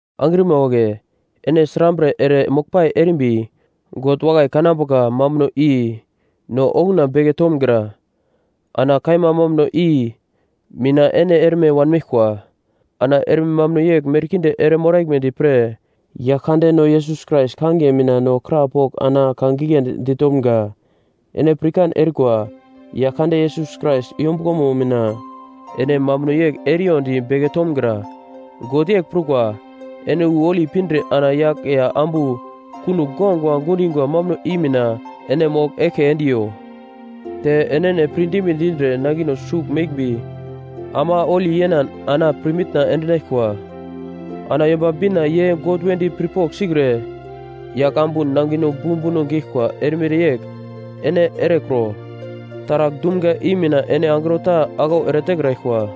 Angrima wagle, ene srambre ere moglpai erimbi God wakai kanambuka mambuno i no okuna beke tomgra. Ana kaima mambuno i mina ene erme wanmeglkwa. Ana erme mambuno yegl merkinde ere moraglmedi pre Yaglkandeno Yesus Krais kangiye mina no krapogl ana ka giglendi ditomga. Ene pirkan erikwa, Yaglkande Yesus Krais yombuglomo mina ene mambuno yegl eriyondi beke tomgra. God yegl prukwa, ene wu holi pindre ana yagl ya ambu kunogl guagua gundingwa mambuno i mina ene mogl eglke endiyo. Te enene pirdime dindre nangino sugl meglmbi ama holi yenan ana pirmitna endinaglkwa. Ana Yomba Bina ye God wedi pirpogl sikre yagl ambu nangino bumbuno geglkwa erimere yegl ene erekro. Taragl dumga i mina ene angro ta aglau eretekraglkwa.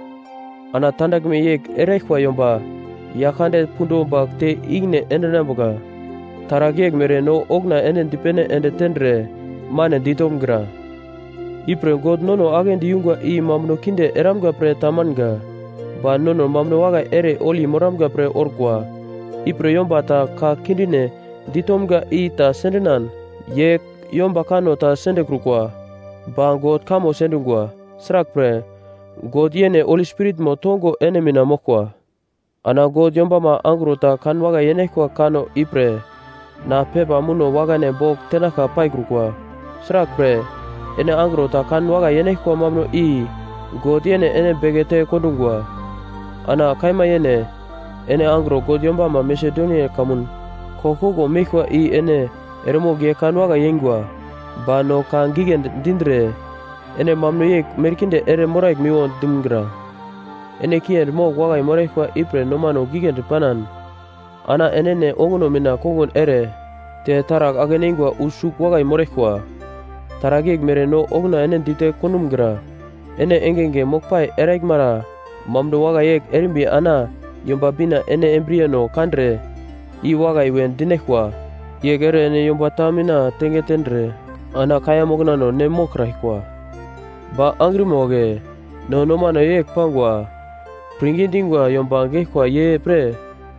Ana tandaglme yegl eraglkwa yomba Yaglkande pundo bagl te ikine endinambuka. Taragl yeglmere no okuna ene dipene ende tendre mane ditomgra. Ipre God nono aglendi yungwa i mambuno kinde eramga pre ta manga, ba nono mambuno wakai ere holi moramga pre orkwa. Ipre yomba ta ka kindine ditomga i ta sendinan ye yomba kanno ta sendekrukwa ba God kamo sendungwa. Sraglpre God yene Holi Spiritmo tongo ene mina moglkwa. Ana God yombama angro ta kanwakai yenaglkwa kanno ipre na pepa muno wakane bogl tenaglka paikrukwa. Sraglpre ene angro ta kan wakai yenaglkwa mambuno i God yene ene bekete kondungwa. Ana kaima yene ene angro God yombama Masedonia kamun koglkoglo meglkwa i ene eremogl ye kan wakai yeingwa. Ba no ka giglendi dindre ene mambuno yegl merkinde ere moraglmiwo dumgra. Ene kiendi mogl wakai moraglkwa ipre nomano giglendi panan, ana enene onguno mina kongun ere, te taragl ake-neingwa wu sugl wakai moraglkwa. Taragl yeglmere no okuna ene dite kondumgra. Ene engenge moglpai eraglmara mambuno wakai yegl erimba ana Yomba Bina ene embriyeno kandre i wakai we dinaglkwa yegl ere ene yomba ta mina tenge tendre, ana kaiya moknano ne moglkraglkwa. Ba angrima wagle, no nomano yegl pangwa pirngi dingwa yomba geglkwa ye pre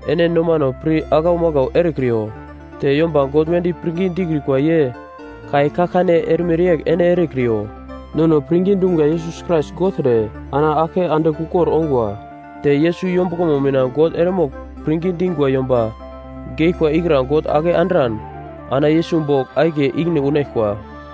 ene nomano pir aglau maglau erekriyo. Te yomba God wedi pirngi dikrikwa ye kai kaglkane erimere yegl ene erekriyo. Nono pirngi dumga Yesus Krais gogltre ana aglke andigl ukor ongwa. Te Yesus yombuglomo mina God eremogl pirngi dingwa yomba geglkwa ikra God ake andran ana Yesus bogl akiye ikine unaglkwa.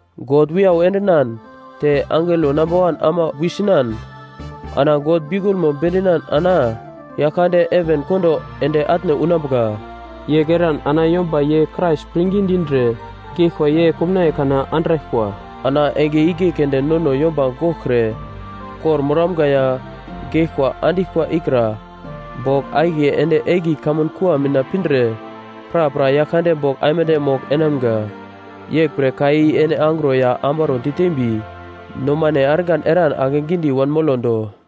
God wiyau endinan te angelo namba wan ama wisinan ana God biukulmo bedinan ana Yaglkande heven kondo ende atne unambuka. Yegl eran ana yomba ye Krais pirngi dindre geglkwa ye komnaiye kana andraglkwa. Ana enge igle keunde nono yomba goglkre kor-moramga ya geglkwa andiglkwa ikra bogl akiye ende egli kamkua mina pindre prapra Yaglkande bogl aimande mogl enamga. Yeglpre ka i ene angro ya ambaro ditembi, nomane argan eran akegidi wanmolo do.